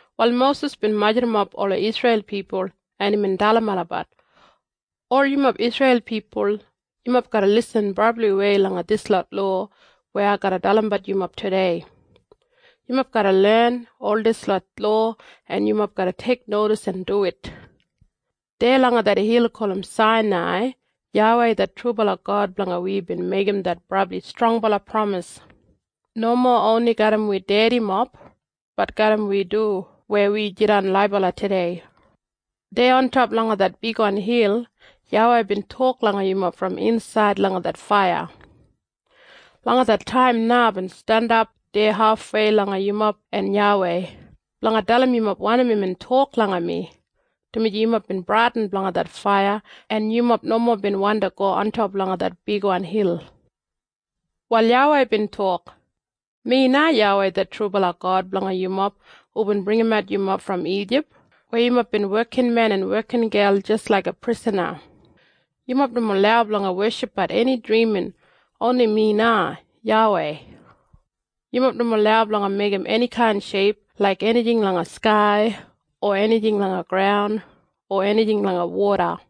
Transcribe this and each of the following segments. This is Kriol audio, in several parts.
Wal Mosis bin majurrumap ola Isreil pipul en imbin dalim olabat, “Ol yumob Isreil pipul, yumob garra lisin brabliwei langa dislot lowa weya ai garra dalimbat yumob tudei. Yumob garra len ol dislot lowa en yumob garra teiknodis en duwit. Deya langa det hil gulum Sainai YAWEI det trubala God blanga wi bin meigim det brabli strongbala pramis, nomo oni garram wi dedimob bat garram wi du weya wi jidan laibala tudei. Deya ontop langa det bigwan hil YAWEI bin tok langa yumob brom insaid langa det faiya. Langa det taim na aibin jandap deya hafwei langa yumob en YAWEI, blanga dalim yumob wanim imbin tok langa mi, dumaji yumob bin bradin blanga det faiya en yumob nomo bin wandi go ontop langa det bigwan hil. “Wal YAWEI bin tok, ‘Mi na YAWEI det trubala God blanga yumob hubin bringimat yumob brom Ijip, weya yumob bin wekinmen en wekingel jis laiga prisana. “‘Yumob nomo lau blanga weshipbat eni drimin, oni mi na, YAWEI. “‘Yumob nomo lau blanga meigim enikain sheip laik enijing langa skai o enijing langa graun o enijing langa woda.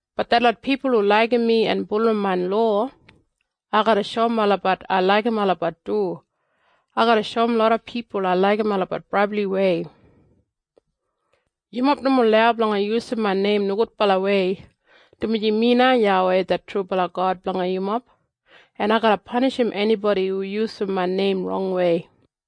Bat detlot pipul hu laigim mi en bulurrum main lowa, ai garra shoum olabat ai laigim olabat du. Ai garra shoum loda pipul ai laigim olabat brabliwei. “‘Yumob nomo lau blanga yusum main neim nogudbalawei, dumaji mi na YAWEI det trubala God blanga yumob, en ai garra panishim enibodi hu yusum main neim rongwei.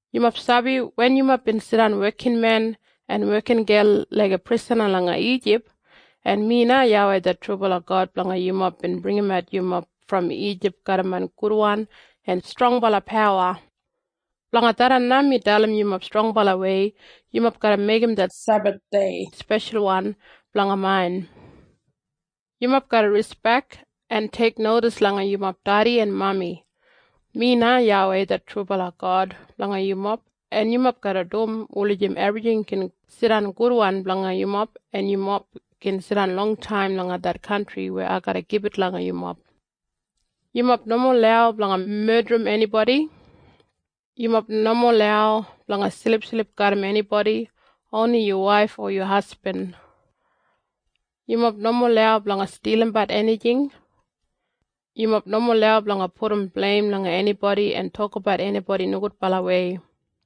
Yumob sabi wen yumob bin jidan wekinmen en wekingel laiga prisana langa Ijip en mi na YAWEI det trubala God blanga yumob bin bringimat yumob brom Ijip garram main gudwan en strongbala pawa. Blanga tharran na mi dalim yumob strongbalawei yumob garra meigim det Sebathdei speshalwan blanga main. “‘Yumob garra rispek en teiknodis langa yumob dedi en mami. Mi na YAWEI det trubala God blanga yumob en yumob garra dum wulijim ebrijing gin jidan gudwan blanga yumob en yumob gin jidan longtaim langa det kantri weya ai garra gibit langa yumob. “‘Yumob nomo lau blanga medrim enibodi. “‘Yumob nomo lau blanga silipsilip garram enibodi, oni yu waif o yu hasbin. “‘Yumob nomo lau blanga stilimbat enijing. “‘Yumob nomo lau blanga pudum bleim langa enibodi en tokabat enibodi nogudbalawei.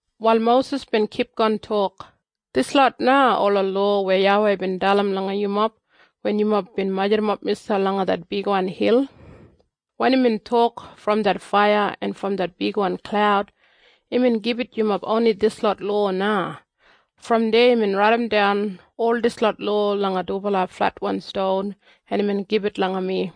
Wal Mosis bin kipgon tok, “Dislot na ola lowa weya YAWEI bin dalim langa yumob wen yumob bin majurrumap miselp langa det bigwan hil. Wen imbin tok brom det faiya en brom det bigwan klaud, imbin gibit yumob oni dislot lowa na. Brom deya imbin raidimdan ol dislot lowa langa dubala fletwan ston en imbin gibit langa mi.”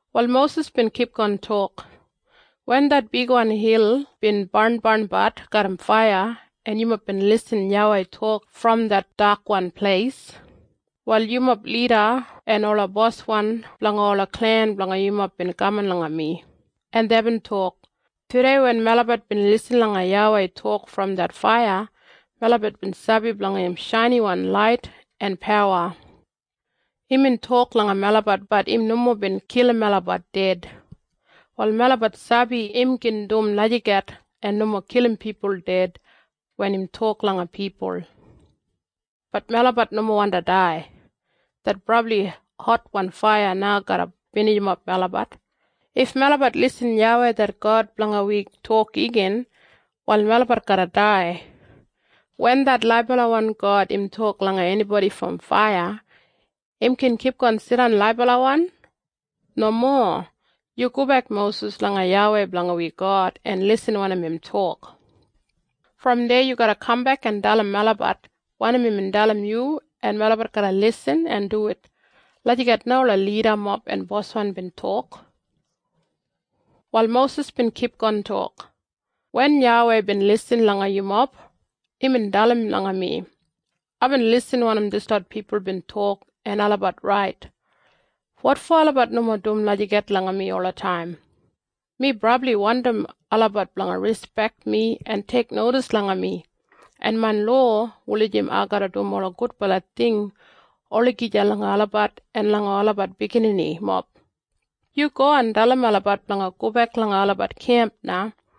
Wal Mosis bin kipgon tok, “Wen det bigwan hil bin barnbarnbat garram faiya en yumob bin irrim YAWEI tok brom det dakwan pleis, wal yumob lida en ola boswan blanga ola klen blanga yumob bin kaman langa mi, en deibin tok, ‘Tudei wen melabat bin lisin langa YAWEI tok brom det faiya melabat bin sabi blanga im shainiwan lait en pawa. Imbin tok langa melabat bat im nomo bin kilim melabat ded. Wal melabat sabi im gin dum lagijat en nomo kilim pipul ded wen im tok langa pipul. Bat melabat nomo wandi dai. Det brabli hotwan faiya na garra binijimap melabat. If melabat irrim YAWEI det God blanga wi tok igin, wal melabat garra dai. Wen det laibalawan God im tok langa enibodi brom faiya, im gin kipgon jidan laibalawan? Nomo. Yu gobek Mosis langa YAWEI blanga wi God en irrim wanim im tok. Brom deya yu garra kambek en dalim melabat wanim imbin dalim yu en melabat garra lisin en duwit.’ Lagijat na ola lidamob en boswan bin tok.” Wal Mosis bin kipgon tok, “Wen YAWEI bin lisin langa yumob, imbin dalim langa mi, ‘Aibin irrim wanim dislot pipul bin tok en olabat rait. Wotfo olabat nomo dum lagijat langa mi olataim? Mi brabli wandim olabat blanga rispek mi en teiknodis langa mi en main lowa wulijim ai garra dum ola gudbala ting olagija langa olabat en langa olabat bigininimob. Yu go en dalim olabat blanga gobek langa olabat kemp na.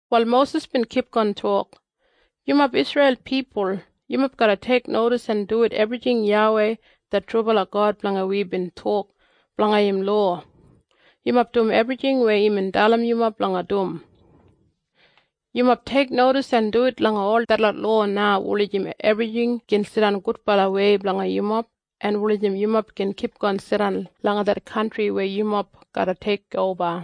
Wal Mosis bin kipgon tok, “Yumob Isreil pipul, yumob garra teiknodis en duwit ebrijing YAWEI det trubala God blanga wi bin tok blanga im lowa. Yumob dum ebrijing weya imbin dalim yumob blanga dum. Yumob teiknodis en duwit langa ol detlot lowa na wulijim ebrijing gin jidan gudbalawei blanga yumob en wulijim yumob gin kipgon jidan langa det kantri weya yumob garra teikoba.”